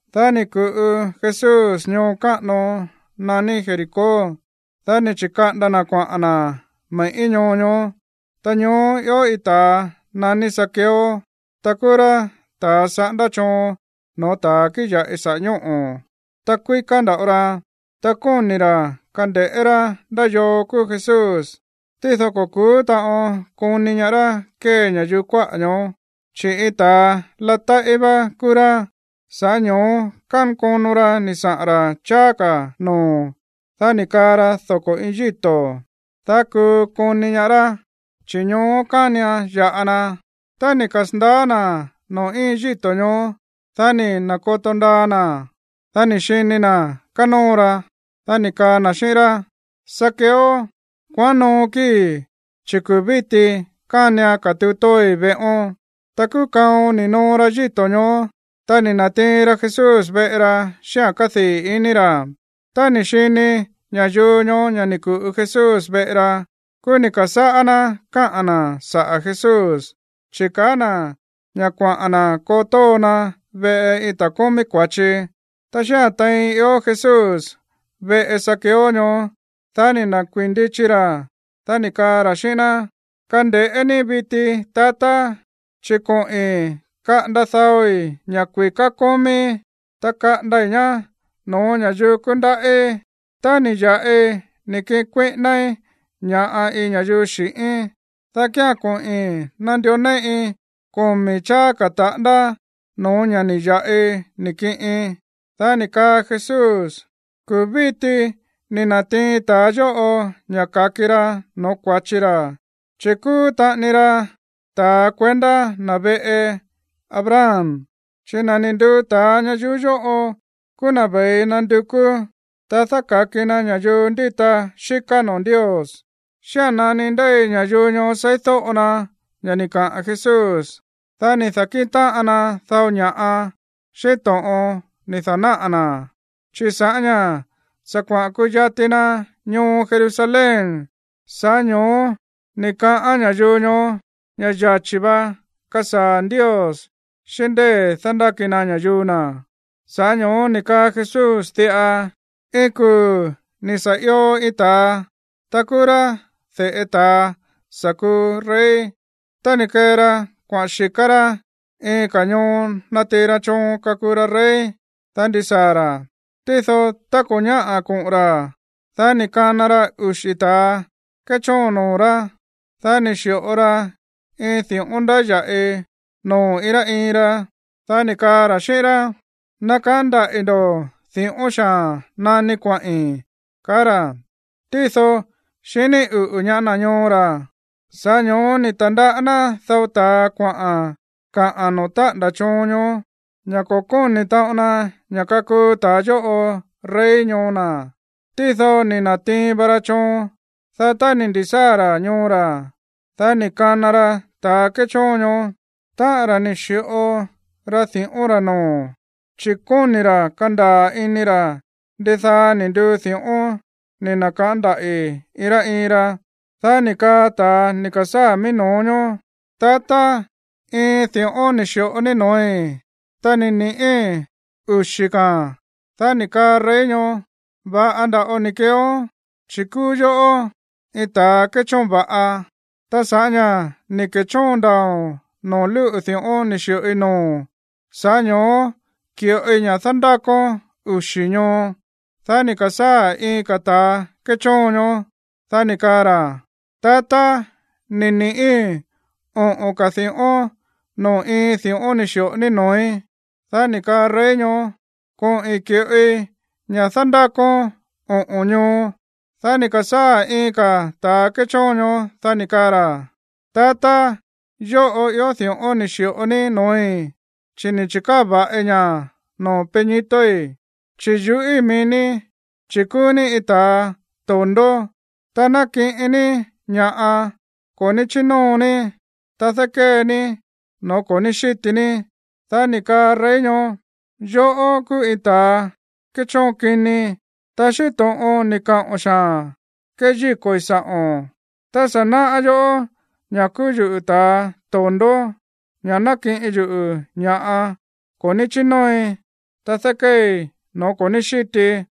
Dá ni̱ ku̱ꞌu Jesús ñoo káꞌano naní Jericó, dá ni̱ chi̱kaꞌanda na̱ kuaꞌa̱n na̱ me̱ꞌí ñoo ñoó. Ta ñoó ió iin ta̱a naní Zaqueo, ta kúú rá ta̱a saꞌándá choon no̱ó ta̱a kíꞌin ya̱ꞌi saꞌa̱ ñóꞌo̱, ta kuíká nda̱ꞌo ra, ta kóni̱ ra̱ kande̱ꞌé rá ndá yoo kúú Jesús, tído ko̱ ku̱ú taꞌon koni ñaá rá kée ña̱yuu kuáꞌa̱ ñoó, chi̱ iin ta̱a latáꞌí vá kúú rá. Sa̱ꞌá ño̱ó kánkono ra ni̱ saꞌa̱n ra̱ cháá ka̱ noo̱. Dá ni̱ kaa ra doko̱ iin yíto̱, dá kuu koni ñaá rá, chi̱ ñoó kánian ya̱ꞌa na. Tá ni̱ kasa̱ndaá na̱ noo̱ íin yíto̱ ñoó, dá ni̱ na̱koto ndaa na̱, dá ni̱ xini na̱ kánóo ra, dá ni̱ kaa na̱ xíꞌín rá: ―Zaqueo, kuaꞌán noo kíi̱, chi̱ kuu̱ víti kánian katuu tóoi veꞌón. Ta kúú kaon ni̱ noo ra yíto̱ ñoó, ta ni̱ na̱tiin ra Jesús veꞌe ra xíꞌa̱n kádii̱ iní ra̱. Tá ni̱ xini ña̱yuu ñoó ña̱ ni̱ ku̱ꞌu Jesús veꞌe ra, kúú ni̱ ka̱sáꞌá ná káꞌa̱n na̱ saꞌa̱ Jesús, chi̱ kaá na̱ ña̱ kuaꞌa̱n na̱ koo tóo na veꞌe iin ta̱a kómí kua̱chi. Ta xía̱n tein ió Jesús veꞌe Zaqueo ñoó, dá ni̱ nda̱kuíi̱n ndichi ra̱, dá ni̱ kaa ra̱ xíꞌín ná: ―Kande̱ꞌé ní viti, tatá, chi̱ koꞌi̱n kaꞌanda daoi̱ ña̱ kui̱ká kómíí, ta kaꞌandai̱ ñá no̱ó ña̱yuu kúndaꞌí. Tá ni̱ ya̱ꞌi ni̱ kiꞌin kuíꞌínáí ña̱ꞌa iin ña̱yuu xi̱ꞌín, dá kía̱n koꞌi̱n nandió néꞌi komi̱ cháá ka̱ taꞌándá no̱ó ña̱ ni̱ ya̱ꞌi ni̱ kiꞌin. Dá ni̱ kaa Jesús: ―Kuu̱ víti ni̱ na̱tiin ta̱a yóꞌo ña̱ ka̱ki ra no̱ó kua̱chi ra̱, chi̱ kúú taꞌani ra ta̱ kuendá na̱ veꞌe Abraham. Chi̱ na̱ ni̱ nduu ta̱a ñayuú yóꞌo kúú na̱ ve̱i nandukú, ta dáka̱ki na ña̱yuu ndíta xíká noo̱ Ndios. Xía̱n nani ndéi ña̱yuu ñoó seídóꞌo na ña̱ ni̱ kaꞌa̱n Jesús, dá ni̱ da̱kíꞌin táꞌan na dao ña̱ꞌa xíꞌín to̱ꞌon ni̱ da̱náꞌa̱ na̱. Chi̱ sa̱ꞌá ña̱ sa̱ kuaꞌa̱n kuyati na ñoo Jerusalén, sa̱ꞌá ño̱ó ni̱ kaꞌán ña̱yuu ñoó ña̱ yachi̱ va kasaa̱ Ndios xíꞌín ndée̱ dándáki na ña̱yuu na̱. Sa̱ꞌá ño̱ó ni̱ kaa Jesús diꞌa: ―Iin kuu̱ ni̱ sa̱ io iin ta̱a, ta kúú rá de̱ꞌe ta̱a sa̱ kuu rey, ta ni̱ kee ra kuaꞌa̱n xi̱ká rá iin ka̱ ñoo natiin ra choon kakuu ra rey, dá ndisaa̱ ra̱. Tído tá ko̱ ñáꞌa̱ koꞌo̱n ra̱, dá ni̱ kana ra uxi̱ ta̱a kéchóon noo̱ rá. Dá ni̱ xi̱ꞌo ra iin di̱ꞌón ndáya̱ꞌi noo̱ iin rá iin ra. Dá ni̱ kaa ra̱ xíꞌín rá: “Nakaꞌán ndaꞌi̱ ndo̱ di̱ꞌón xaa̱n nani kuaꞌi̱n”, kaá ra̱. Tído xiní uꞌu̱ ñaá na̱ ñoo ra̱. Sa̱ꞌá ño̱ó ni̱ ta̱ndaꞌá ná dao ta̱a kuaꞌa̱n kaꞌa̱n noo̱ táꞌa̱nda̱ choon ñoó ña̱ ko̱ kóni̱ taꞌon na ña̱ kakuu ta̱a yóꞌo rey ñoo na̱. ’Tído ni̱ na̱tiin va ra choon. Dá tá ni̱ ndi̱sáa̱ ra̱ ñoo ra̱, dá ni̱ kana ra ta̱a kéchóon ñoó, táꞌa̱n ra̱ ni̱ xi̱ꞌo ra di̱ꞌón ra̱ noo̱, chi̱ kóni̱ ra̱ kandaa̱ ini ra̱ ndidaa ni̱ nduu di̱ꞌón ni̱ na̱kaꞌán ndaꞌi̱ iin rá iin ra. Dá ni̱ kaa ta̱a ni̱ ka̱sáa̱ mií no̱ó ñoó: “Tatá, iin di̱ꞌón ni̱ xi̱ꞌo ní no̱ói̱, ta ni̱ ni̱ꞌí uxi̱ ka̱a̱n.” Dá ni̱ kaa rey ñoó: “Va̱ꞌa nda̱ꞌo ni̱ keeón, chi̱ kúú yoꞌó iin ta̱ kéchóon va̱ꞌa. Ta sa̱ꞌá ña̱ ni̱ ke̱chóon ndaa̱o̱n noo̱ lúꞌu̱ di̱ꞌón ni̱ xi̱ꞌoi noo̱o̱n, sa̱ꞌá ño̱ó ki̱ꞌoi ña̱ dándákón uxi̱ ñoo.” ’Dá ni̱ ka̱sáa̱ iin ka̱ ta̱a kéchóon ñoó. Dá ni̱ kaa ra̱: “Tatá, ni̱ ni̱ꞌí oꞌo̱n ka̱ di̱ꞌón noo̱ iin di̱ꞌón ni̱ xi̱ꞌo ní no̱ói̱.” Dá ni̱ kaa rey ñoó: “Koꞌi̱n ki̱ꞌoi ña̱ dándákón oꞌo̱n ñoo.” ’Dá ni̱ ka̱sáa̱ iin ka̱ ta̱a kéchóon ñoó, dá ni̱ kaa ra̱: “Tatá, yóꞌo ió di̱ꞌón ni̱ xi̱ꞌo ní noo̱í, chi̱ ni̱ chi̱káa̱ va̱ꞌi ña̱ noo̱ peñitoi̱, chi̱ yuꞌíi̱ mií ní, chi̱ kúú ní iin ta̱a to̱ndó, ta nákiꞌin ní ña̱ꞌa ko̱ ní chínóo ní, ta dákée ní no̱ó ko̱ ní xíti ní.” Dá ni̱ kaa rey ñoó: “Yoꞌó kúú iin ta̱ kéchóon kini, ta xíꞌín to̱ꞌon ni̱ kaꞌo̱n xaa̱n keyíko̱i̱ sa̱ꞌo̱n. Ta sa̱ náꞌá yoꞌó ña̱ kúú yuꞌu̱ ta̱a to̱ndó, ña̱ nákiꞌin yuꞌu̱ ña̱ꞌa ko̱ ní chínóoi, ta dákéei no̱ó ko̱ ní xítii,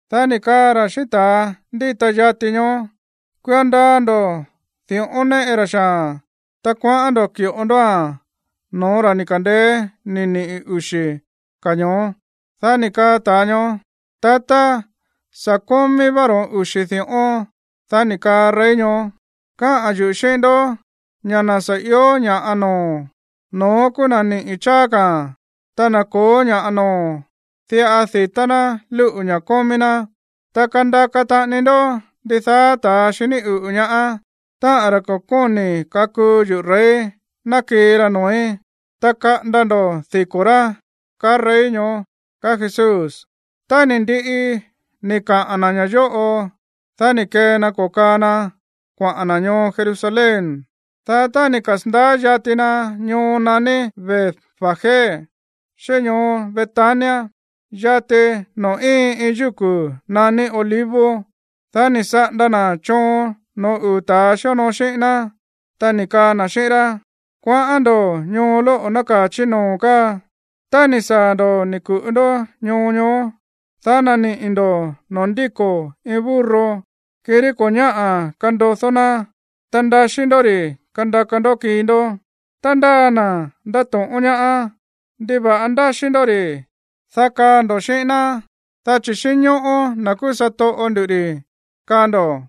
’Dá ni̱ kaa ra̱ xíꞌín ta̱a ndíta yati ñoó: “Kuio ndaa ndo̱ di̱ꞌón néꞌe ra xaa̱n, ta kuaꞌán ndo̱ ki̱ꞌo ndóa̱n no̱ó ra̱ ni̱ ka̱ndeé ni̱ niꞌi̱ uxi̱ ka̱a̱n ñoó.” Dá ni̱ kaa ta̱a ñoó: “Tatá, sa̱ kómí vá ro̱ón uxi̱ di̱ꞌón.” Dá ni̱ kaa rey ñoó: “Káꞌa̱n yuꞌu̱ xíꞌín ndó ña̱ na̱ sa̱ ió ña̱ꞌa noo̱, no̱ón kúú na̱ niꞌi̱ cháá ka̱a̱n. Ta na̱ ko̱ó ña̱ꞌa noo̱, diꞌa di̱tá ná lúꞌu̱ ña̱ kómí ná. Ta kandaka taꞌani ndó ndidaá ta̱a xiní uꞌu̱ ñaá, táꞌa̱n ra̱ ko̱ kóni̱ kakuu yuꞌu̱ rey, ná kii ra noo̱í, ta kaꞌanda ndo̱ diko̱ rá”, kaá rey ñoó ―kaá Jesús. Tá ni̱ ndiꞌi ni̱ kaꞌa̱n na̱ ña̱ yóꞌo, dá ni̱ kee na ko̱kaa na kuaꞌa̱n na̱ ñoo Jerusalén. Dá tá ni̱ kasa̱ndaá yati na ñoo naní Betfagé xíꞌín ñoo Betania, yati noo̱ íin iin yúku̱ naní Olivos, dá ni̱ saꞌanda na̱ choon no̱ó uu̱ ta̱a xíonoo xíꞌín ná, ta ni̱ kaa na̱ xíꞌín rá: ―Kuaꞌán ndo̱ ñoo lóꞌo̱ nákaa̱ chí noo̱ káa. Tá ni̱ saa̱ ndo̱ ni̱ ku̱ꞌu ndó ñoo ñoó, dá naniꞌi̱ ndo̱ noo̱ ndíko̱ iin burro, kirí ko̱ ñáꞌa̱ kandodó ná. Ta ndaxí ndó ri̱ kandaka ndó kii ndó. Tá ndáa na̱ ndato̱ꞌón ñaá: “¿Ndiva̱ꞌa ndáxí ndó ri̱?”, dá kaa ndo̱ xíꞌín ná: “Dá chi̱ xínñóꞌó na̱ kúú satoꞌo ndu̱ rí”, kaa ndo̱.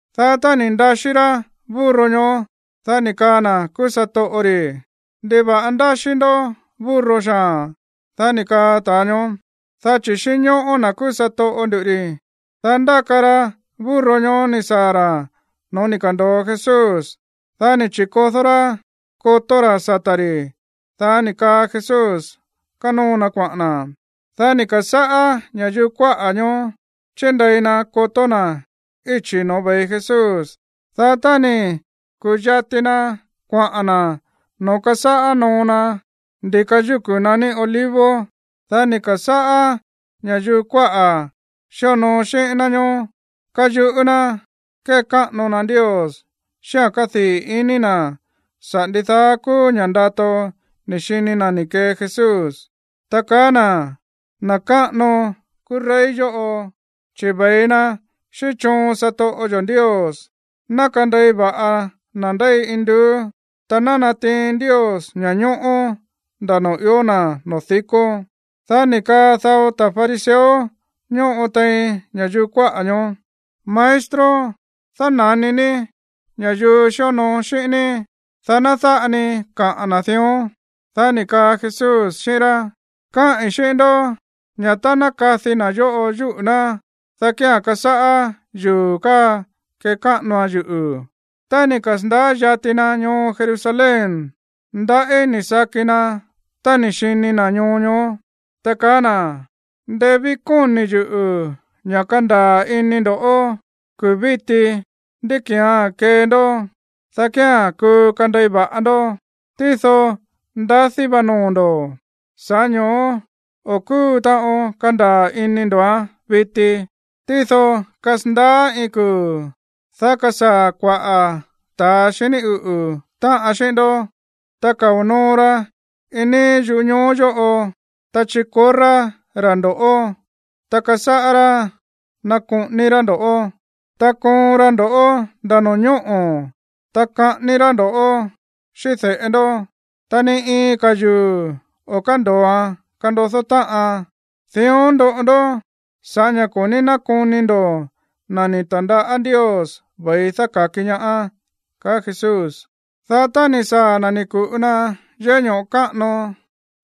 Dá tá ni̱ ndaxí rá burro ñoó, dá ni̱ kaa na̱ kúú satoꞌo ri̱: ―¿Ndiva̱ꞌa ndáxí ndó burro xaa̱n? Dá ni̱ kaa ta̱a ñoó: ―Dá chi̱ xínñóꞌó na̱ kúú satoꞌo nduꞌu̱ ri̱. Dá ndáka ra burro ñoó ni̱ saa̱ ra̱ no̱ó ni̱ ka̱ndo̱o Jesús. Dá ni̱ chi̱kodó rá kotó ra̱ sata̱ ri̱. Dá ni̱ kaa Jesús kánóo na kuaꞌa̱n na̱. Dá ni̱ ka̱sáꞌá ña̱yuu kuáꞌa̱ ñoó chíndei na kotó na̱ íchi̱ no̱ó ve̱i Jesús. Dá tá ni̱ ku̱yati na kuaꞌa̱n na̱ noo̱ kásáꞌá noo na ndi̱ka yúku̱ naní Olivos, dá ni̱ ka̱sáꞌá ña̱yuu kuáꞌa̱ xíonoo xíꞌín ná ñoó káyuꞌú ná kékáꞌano na Ndios xíꞌa̱n kádii̱ ini na̱ saꞌa̱ ndidaá kúú ña̱ꞌa ndato ni̱ xini na̱ ni̱ kee Jesús, ta kaá na̱: ―¡Na̱ káꞌano kúú rey yóꞌo, chi̱ ve̱i na xíꞌín choon satoꞌo yo̱ Ndios! ¡Ná kandei va̱ꞌa na̱ ndéi induú! ¡Ta ná natiin Ndios ña̱ñóꞌó nda̱ noo̱ ió na̱ noo̱ dikó! Dá ni̱ kaa dao ta̱ fariseo ñóꞌo tein ña̱yuu kuáꞌa̱ ñoó: ―Maestro, dána̱ni ní ña̱yuu xíonoo xíꞌín ní, dá ná dáꞌa ni kaꞌa̱n na̱ dión. Dá ni̱ kaa Jesús xíꞌín rá: ―Káꞌi̱n xíꞌín ndó ña̱ tá ná kadi na̱ yóꞌo yúꞌu̱ ná, dá kía̱n kasáꞌá yuu̱ káa kekáꞌanoan yuꞌu̱. Tá ni̱ kasa̱ndaá yati na ñoo Jerusalén, ndaꞌí ni̱ saki na tá ni̱ xini na̱ ñoo ñoó, ta kaá na̱: ―Ndeé ví kóni̱ yuꞌu̱ ña̱ kandaa̱ ini ndo̱ kuu̱ víti ndí ki̱án kee ndó, dá kía̱n kuu kandei va̱ꞌa ndó. Tído ndadí vá noo̱ ndo̱, sa̱ꞌá ño̱ó o̱ kúu taꞌon kandaa̱ ini ndo̱án viti. Tído kasandaá iin kuu̱, dá kasaa̱ kua̱ꞌá ta̱a xiní uꞌu̱ táꞌan xíꞌín ndó, ta kao̱ noo ra iin níí yúꞌu̱ ñoo yóꞌo, ta chikorrá ra̱ ndo̱ꞌó, ta kasáꞌá rá nakoꞌoni ra̱ ndo̱ꞌó, ta koon ra ndo̱ꞌó nda̱ no̱ñóꞌo̱, ta kaꞌání rá ndo̱ꞌó xíꞌín de̱ꞌe ndó. Ta ni iin ka̱ yuu̱ o̱ kándo̱oan kandodó táꞌan. Dión ndoꞌo ndó sa̱ꞌá ña̱ ko̱ ní nákoni ndo̱ na̱ ni̱ ta̱ndaꞌá Ndios ve̱i dáka̱ki ñaá ―kaá Jesús. Dá tá ni̱ saa̱ na̱, ni̱ ku̱ꞌu na yéꞌé ño̱ꞌo káꞌano.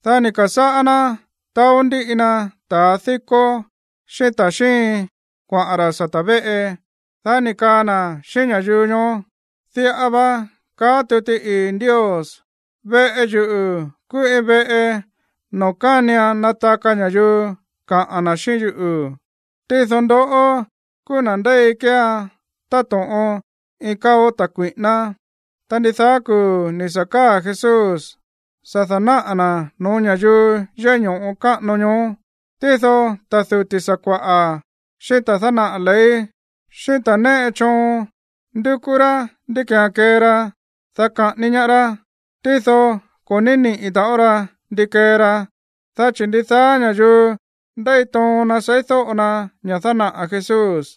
Dá ni̱ ka̱sáꞌá ná taó ndíꞌi na ta̱ díkó, xíꞌín ta̱ xíin kuaꞌa̱n ra̱ sata̱ véꞌe. Dá ni̱ kaa na̱ xíꞌín ña̱yuu ñoó: ―Diꞌa va kaá tuti ii̱ Ndios: “Veꞌe yuꞌu̱ kúú iin veꞌe noo̱ kánian nataka ña̱yuu kaꞌa̱n na̱ xíꞌín yuꞌu̱.” Tído ndoꞌó kúú na̱ ndéi kéean táto̱ꞌon iin káo̱ ta̱ kui̱ꞌíná. Ta ndidaá kuu̱ ni̱ sa̱ káa̱ Jesús sa̱ da̱náꞌa̱ na̱ no̱ó ña̱yuu yéꞌé ño̱ꞌo káꞌano ñoó. Tído ta̱ duti̱ sakua̱ꞌa̱, xíꞌín ta̱ dánaꞌa̱ ley, xíꞌín ta̱ néꞌe choon ndúkú rá ndí ki̱án kee ra, dá kaꞌání ñaá rá. Tído ko̱ ní niꞌi̱ taꞌon ra ndi kee ra, dá chi̱ ndidaá ña̱yuu ndéi toon na seídóꞌo na ña̱ dánaꞌa̱ Jesús.